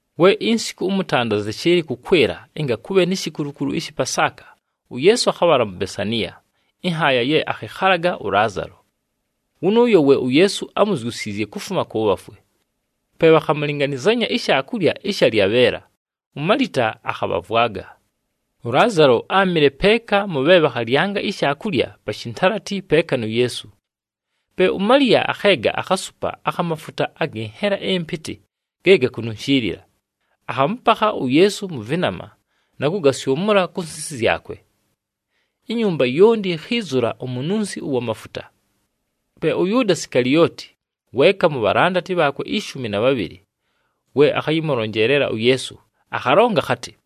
We insiku ʉmʉtanda zɨshɨɨlɨ kʉkwɨla ɨnga kʉbhe ni shikulukulu ɨshɨ Pasaaka, uYeesu akhabhala mu Besaniya, ɨnhaaya ye akhɨkhalaga ʉLaazalo. Wʉnʉʉyo we uYeesu ámuzyusiizye kufuma kʉ bhafwe. Pe bhakhamʉlɨnganɨzanya ishaakulya ɨsha lyabheela, uMalita akhabhavwaga. ɄLaazalo áamɨle peeka mʉ bhe bhakhalyanga ishaakulya pa shintalati peeka nu Yeesu. Pe uMaliya akheega akhasupa akha mafuta agɨ nhela ɨmpɨtɨ ge gakununshiilila, akhamʉpakha uYeesu mʉ vɨnama na kʉgasyʉmʉla ku nsisi zyakwe. Inyumba yonti yikhiizula umununsi ʉwa mafuta. Pe ʉYʉʉda Sikalioti, weeka mu bhalandati bhaakwe ishumi na bhabhɨlɨ, we akhayɨmʉlonjeelela uYeesu, akhalonga akhatɨ,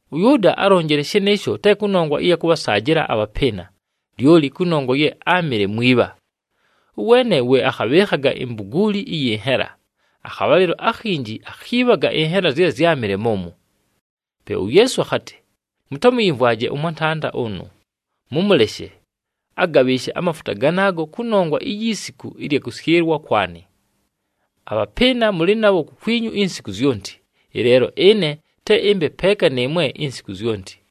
ɄYʉʉda álonjile shɨnɨɨsho te kʉnongwa ɨya kʉbhasaajɨla abhapɨɨna, lyoli kʉnongwa ye áamɨle mwibha. Ʉweene we akhabhɨɨkhaga imbuguuli ɨyɨ nhela, akhabhalɨlo akhinji akhiibhaga ɨnhela zye zyámɨle mʉmwo. Pe uYeesu akhatɨ, “Mʉtamʉyɨmvwaje ʉmwantanda ʉnʉ, mʉmʉleshe, agabhɨɨshe amafuta ganaago kʉnongwa iyi siku ɨlya kʉsyɨlwa kwanɨ. Abhapɨɨna mʉlɨ nabho kukwinyu insiku zyonti, ɨleelo ɨne te ɨmbe peeka nɨɨmwe insiku zyonti.”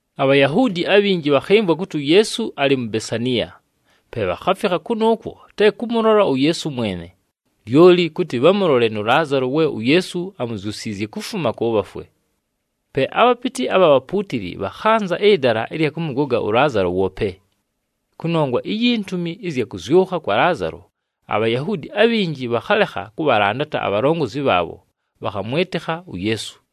ABhayahuudi abhinji bhakhɨmvwa kʉtɨ uYeesu alɨ mu Besaniya. Pe bhakhafikha kʉnʉʉkwo te kʉmʉlola uYeesu mwene, lyoli kʉtɨ bhamʉlole nʉ Laazalo we uYeesu amuzyusiizye kufuma kʉ bhafwe. Pe abhapɨtɨ abha bhapuutili bhakhanza ɨdala ɨlya kʉmʉgoga ʉLaazalo woope. Kʉnongwa iyi ntumi ɨzya kʉzyʉkha kwa Laazalo, aBhayahuudi abhinji bhakhalekha kʉbhalandata abhalongozi bhaabho, bhakhamwɨtɨkha uYeesu.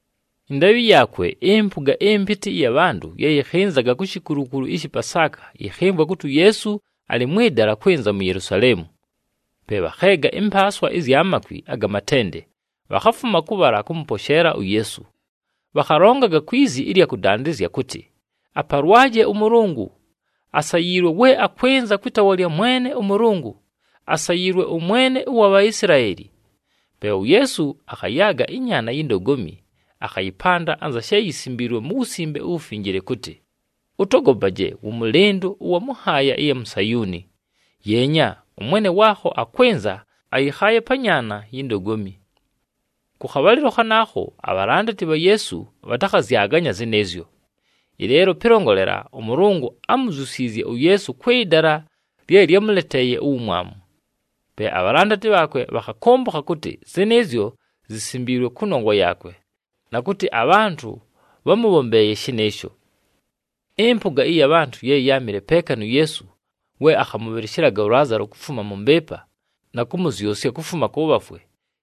Ɨndaabhɨ yaakwe, ɨmpʉga ɨmpɨtɨ ɨya bhantʉ ye yɨkhɨnzaga ku shikulukulu ɨshɨ Pasaaka yɨkhɨmvwa kʉtɨ uYeesu alɨ mwɨ dala kwɨnza mu Yelusaleemu. Pe bhakheega ɨmpaaswa ɨzya makwi aga matende, bhakhafuma kʉbhala kʉmʉposheela uYeesu. Bhakhalongaga kwi zi ɨlya kʉdandɨzya kʉtɨ, “Apalwaje ʉMʉlʉngʉ! Asayiilwe we akwɨnza kwɨ taawa lya Mwene ʉMʉlʉngʉ! Asayiilwe ʉMwene ʉwa Bhaisilaeli.” Pe uYeesu akhayaaga ɨnyaana yi ndogomi, akhayɨpanda anza she yisimbiilwe mu Wusimbe uWufinjile kʉtɨ, “Ʉtogopaje wʉmʉlɨndʉ ʉwa mʉ nhaaya ɨya mu Sayuuni! Yeenya, ʉMwene waakho akwɨnza, ayɨkhaaye pa nyaana yi ndogomi!” Kʉ khabhalɨlo khanaakho, abhalandati bha Yeesu bhatakhazyaganya zɨnɨɨzyo. Ɨleelo pɨlongolela, ʉMʉlʉngʉ ámuzyusiizye uYeesu kwɨ dala lye lyámʉleteeye uwumwamu. Pe abhalandati bhaakwe bhakhakʉmbʉkha kʉtɨ zɨnɨɨzyo zisimbiilwe kʉnongwa yaakwe, na kʉtɨ abhantʉ bhámʉbhombeeye shɨnɨɨsho. Ɨmpʉga ɨya bhantʉ ye yáamɨle peeka nu Yeesu we akhamʉbhɨlɨshɨlaga ʉLaazalo kufuma mʉ mbɨɨpa, na kʉmʉzyʉsya kufuma kʉ bhafwe,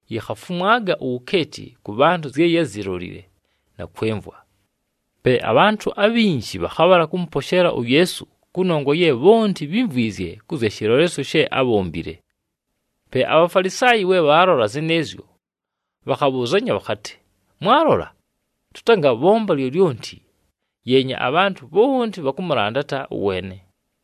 yikhafumwaga uwukeeti kʉ bhantʉ zye yázilolile na kwɨmvwa. Pe abhantʉ abhinji bhakhabhala kʉmʉposheela uYeesu kʉnongwa ye bhonti bhímvwizye kʉ zya shɨlolesyo she ábhombile. Pe aBhafalisaayi we bhaalola zɨnɨɨzyo, bhakhabhʉʉzanya bhakhatɨ, “Mwalola? Tʉtangabhomba lyolyonti! Yeenya, abhantʉ bhonti bhakʉmʉlandata ʉweene.”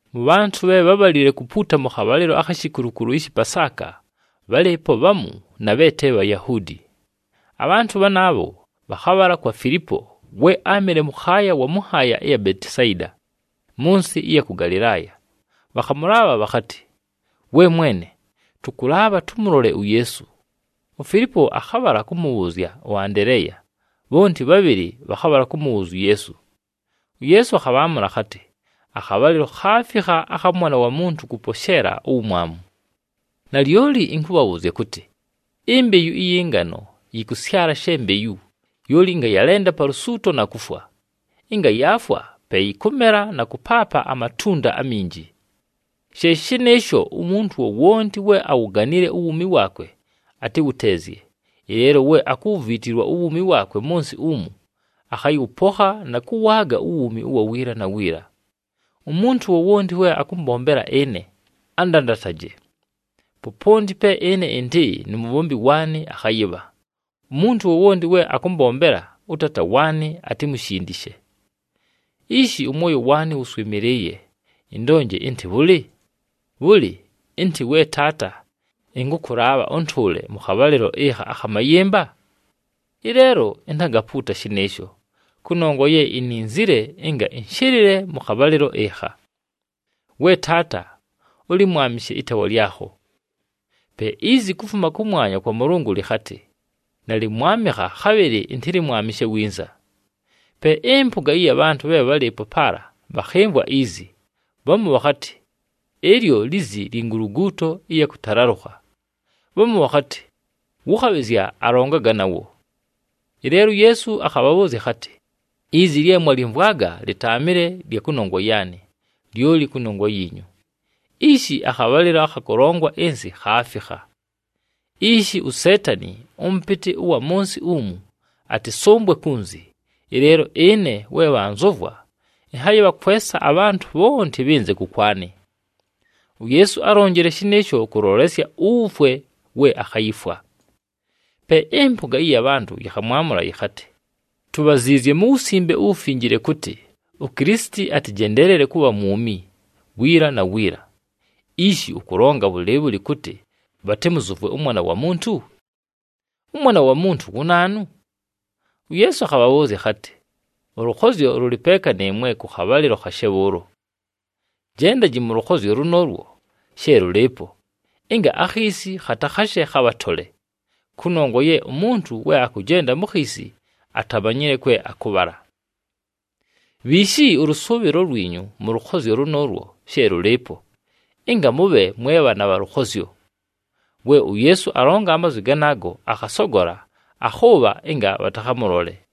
Mʉ bhantʉ bhe bhábhalile kupuuta mʉ khabhalɨlo akhi shikulukulu ɨshɨ Pasaaka, bhálɨɨpo bhamu na bhe te Bhayahuudi. Abhantʉ bhanaabho bhakhabhala kwa Filipo we áamɨle mʉkhaaya wa mʉ nhaaya ɨya mu Betisayida mʉ nsɨ ɨya kʉ Galɨlaaya, bhakhamʉlaabha bhakhatɨ, “We mwene, tʉkʉlaabha tʉmʉlole uYeesu.” UFilipo akhabhala kʉmʉbhʉʉzya ʉAndeleeya, bhonti bhabhɨlɨ bhakhabhala kʉmʉbhʉʉzya uYeesu. UYeesu akhabhaamʉla akhatɨ, “Akhabhalɨlo khaafikha akha Mwana wa Muntu kʉposheela uwumwamu. Nalyoli ɨnkʉbhabhʉʉzya kʉtɨ, imbeyu ɨyɨ ngano yɨkʉsyala she mbeyu, lyoli ɨnga yalenda pa lusuuto na kufwa. Ɨnga yaafwa, pe yɨkʉmela na kʉpaapa amatunda aminji. She shɨnɨɨsho, umuntu wowonti we awuganile uwuumi waakwe, atɨwʉteezye, ɨleelo we akuwuviitilwa uwuumi waakwe mʉ nsɨ umu, akhayɨwʉpokha na kʉwaaga uwuumi ʉwa wiila na wiila. Umuntu wowonti we akʉmbombela ɨne, andandataje. Poponti pe ɨne ɨndɨ nu mubhombi waanɨ akhayɨbha. Umuntu wowonti we akʉmbombela, ʉTaata waanɨ atimushindishe. “Ishi ʉmwoyo waanɨ wʉswɨmɨlɨɨye. Ɨndonje ɨntɨ bhʉlɨ? Bhʉlɨ, ɨntɨ, ‘We Taata, ɨnkʉkʉlaabha ʉntʉʉle mʉ khabhalɨlo ɨkha akha mayɨmba’? Ɨleelo intangapuuta shɨnɨɨsho, kʉnongwa ye ininzile ɨnga ɨnshɨlɨle mʉ khabhalɨlo ɨkha. We Taata, ʉlɨmwamɨshe ɨtaawa lyakho.” Pe izi kufuma kʉmwanya kwa Mʉlʉngʉ lɨkhatɨ, “Nalɨmwamɨkha, khabhɨlɨ ɨntɨlɨmwamɨshe winza.” Pe ɨmpʉga ɨya bhantʉ bhe bhálɨɨpo paala bhakhɨmvwa izi, bhamu bhakhatɨ, “Ɨlyo lizi lyi nguluguuto ɨya kʉtalalʉkha.” Bhamu bhakhatɨ, “Wʉ khabhɨzya alongaga nawo.” Ɨleelo uYeesu akhabhabhʉʉzya akhatɨ, “Izi lye mwalyɨmvwaga lɨtaamɨle lya kʉnongwa yaanɨ, lyoli kʉnongwa yiinyu. Ishi akhabhalɨlo akha kʉlongwa ɨnsɨ khaafikha. Ishi uSeetani, ʉmʉpɨtɨ ʉwa mʉ nsɨ umu, atɨsʉmbwe kunzi. Ɨleelo ɨne we bhanzʉvwa, ɨnhayɨbhakwesa abhantʉ bhonti bhɨnze kʉkwanɨ.” UYeesu álonjile shɨnɨɨsho kʉlolesya uwufwe we akhayifwa. Pe ɨmpʉga ɨya bhantʉ yɨkhamwamʉla yɨkhatɨ, “Tubhaziizye mu Wusimbe uWufinjile kʉtɨ uKilisiti atɨjendeelele kʉbha mwumi wiila na wiila. Ishi ʉkʉlonga bhʉlɨɨbhʉlɨ kʉtɨ bhatɨmʉzʉvwe ʉMwana wa Muntu? ɄMwana wa Muntu wu naanu?” UYeesu akhabhabhʉʉzya akhatɨ, “Ʉlʉkhozyo lʉlɨ peeka nɨɨmwe kʉ khabhalɨlo khashe bhʉʉlo. Jendaji mʉ lʉkhozyo lʉnʉʉlwo she lʉlɨɨpo, ɨnga akhiisi khatakhashe khabhatole, kʉnongwa ye umuntu we akʉjenda mu khiisi, atamanyile kwe akʉbhala. Bhiishi ʉlʉsʉʉbhɨlo lwinyu mʉ lʉkhozyo lʉnʉʉlwo she lʉlɨɨpo, ɨnga mʉbhe mwe bhaana bha lʉkhozyo.” We uYeesu alonga amazwi ganaago, akhasogola, akhʉʉbha ɨnga bhatakhamʉlole.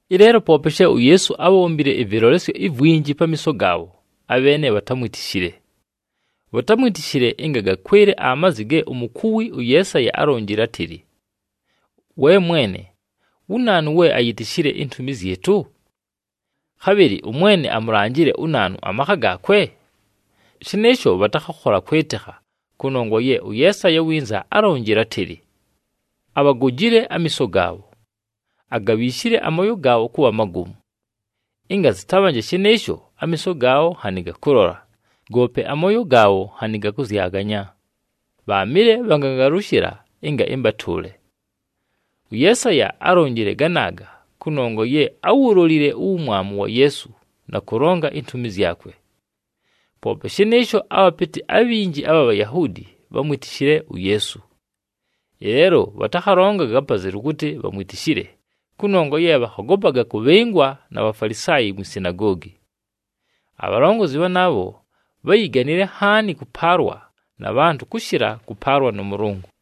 Ɨleelo poope she uYeesu ábhombile ɨvɨlolesyo ivwinji pamiiso gaabho, abheene bhatámwitishile. Bhatámwitishile ɨnga gakwɨle amazwi ge umukuwi ʉYeesaya álonjile átɨlɨ, “We Mwene, wu naanu we ayitishile intumi zyɨtʉ? Khabhɨlɨ ʉMwene amulanjile unaanu amakha gaakwe?” Shɨnɨɨsho bhatakhakhola kwɨtɨkha, kʉnongwa ye ʉYeesaya iwinza álonjile átɨlɨ, “Abhagojile amiiso gaabho, agabhiishile amooyo gaabho kʉbha magomu. Ɨnga zɨtabhanje shɨnɨɨsho, amiiso gaabho nhanɨ gakʉlola, goope amooyo gaabho nhanɨ gakʉzyaganya, bhaamɨle bhagangalʉshɨla, ɨnga ɨmbatʉʉle.” ɄYeesaya álonjile ganaaga kʉnongwa ye áwulolile uwumwamu wa Yeesu na kʉlonga intumi zyakwe. Poope shɨnɨɨsho, abhapɨtɨ abhinji abha Bhayahuudi bhámwitishile uYeesu. Ɨleelo bhatakhalongaga apazelu kʉtɨ bhamwitishile kʉnongwa ye bhakhogopaga kʉbhɨngwa na Bhafalisaayi mwi sinagoogi. Abhalongozi bhanaabho bháyiganile nhaani kʉpaalwa na bhantʉ kʉshɨla kʉpaalwa nʉ Mʉlʉngʉ.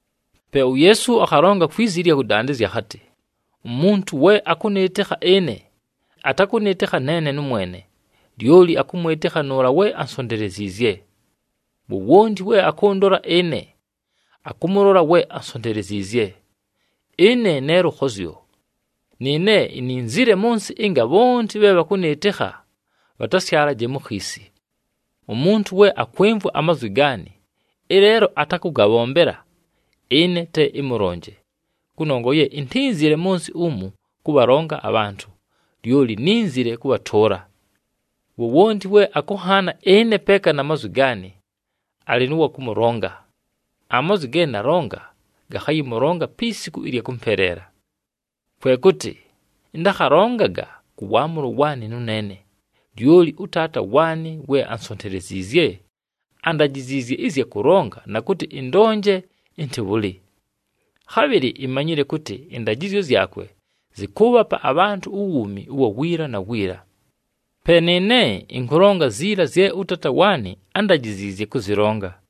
Pe uYeesu akhalonga kwi zi ɨlya kʉdandɨzya akhatɨ, “Umuntu we akʉnɨɨtɨkha ɨne, atakʉnɨɨtɨkha neene nʉmwene, lyoli akʉmwɨtɨkha nʉʉla we ansonteleziizye. Wowonti we akʉndola ɨne, akʉmʉlola we ansonteleziizye. Ɨne ne lʉkhozyo, nɨɨne ininzile mʉ nsɨ ɨnga bhonti bhe bhakʉnɨɨtɨkha, bhatasyalaje mu khiisi. Umuntu we akwɨmvwa amazwi gaanɨ, ɨleelo atakʉgabhombela, ɨne te ɨmʉlonje, kʉnongwa ye intínzile mʉ nsɨ umu kʉbhalonga abhantʉ, lyoli nínzile kʉbhatʉʉla. Wowonti we akʉnhaana ɨne peeka na mazwi gaanɨ alɨ nʉ wa kʉmʉlonga. Amazwi ge nalonga gakhayɨmʉlonga pi siku ɨlya kʉmpeleela. Kwe kʉtɨ ɨntakhalongaga kʉ waamʉlo waanɨ nʉneene, lyoli ʉTaata waanɨ we ansonteleziizye, andajiziizye ɨzya kʉlonga na kʉtɨ ɨndonje ɨntɨ bhʉlɨ. Khabhɨlɨ imanyile kʉtɨ ɨndajɨzyo zyakwe zɨkʉʉbhapa abhantʉ uwuumi ʉwa wiila na wiila. Pe nɨɨne ɨnkʉlonga ziila zye ʉTaata waanɨ ándajiziizye kʉzɨlonga.”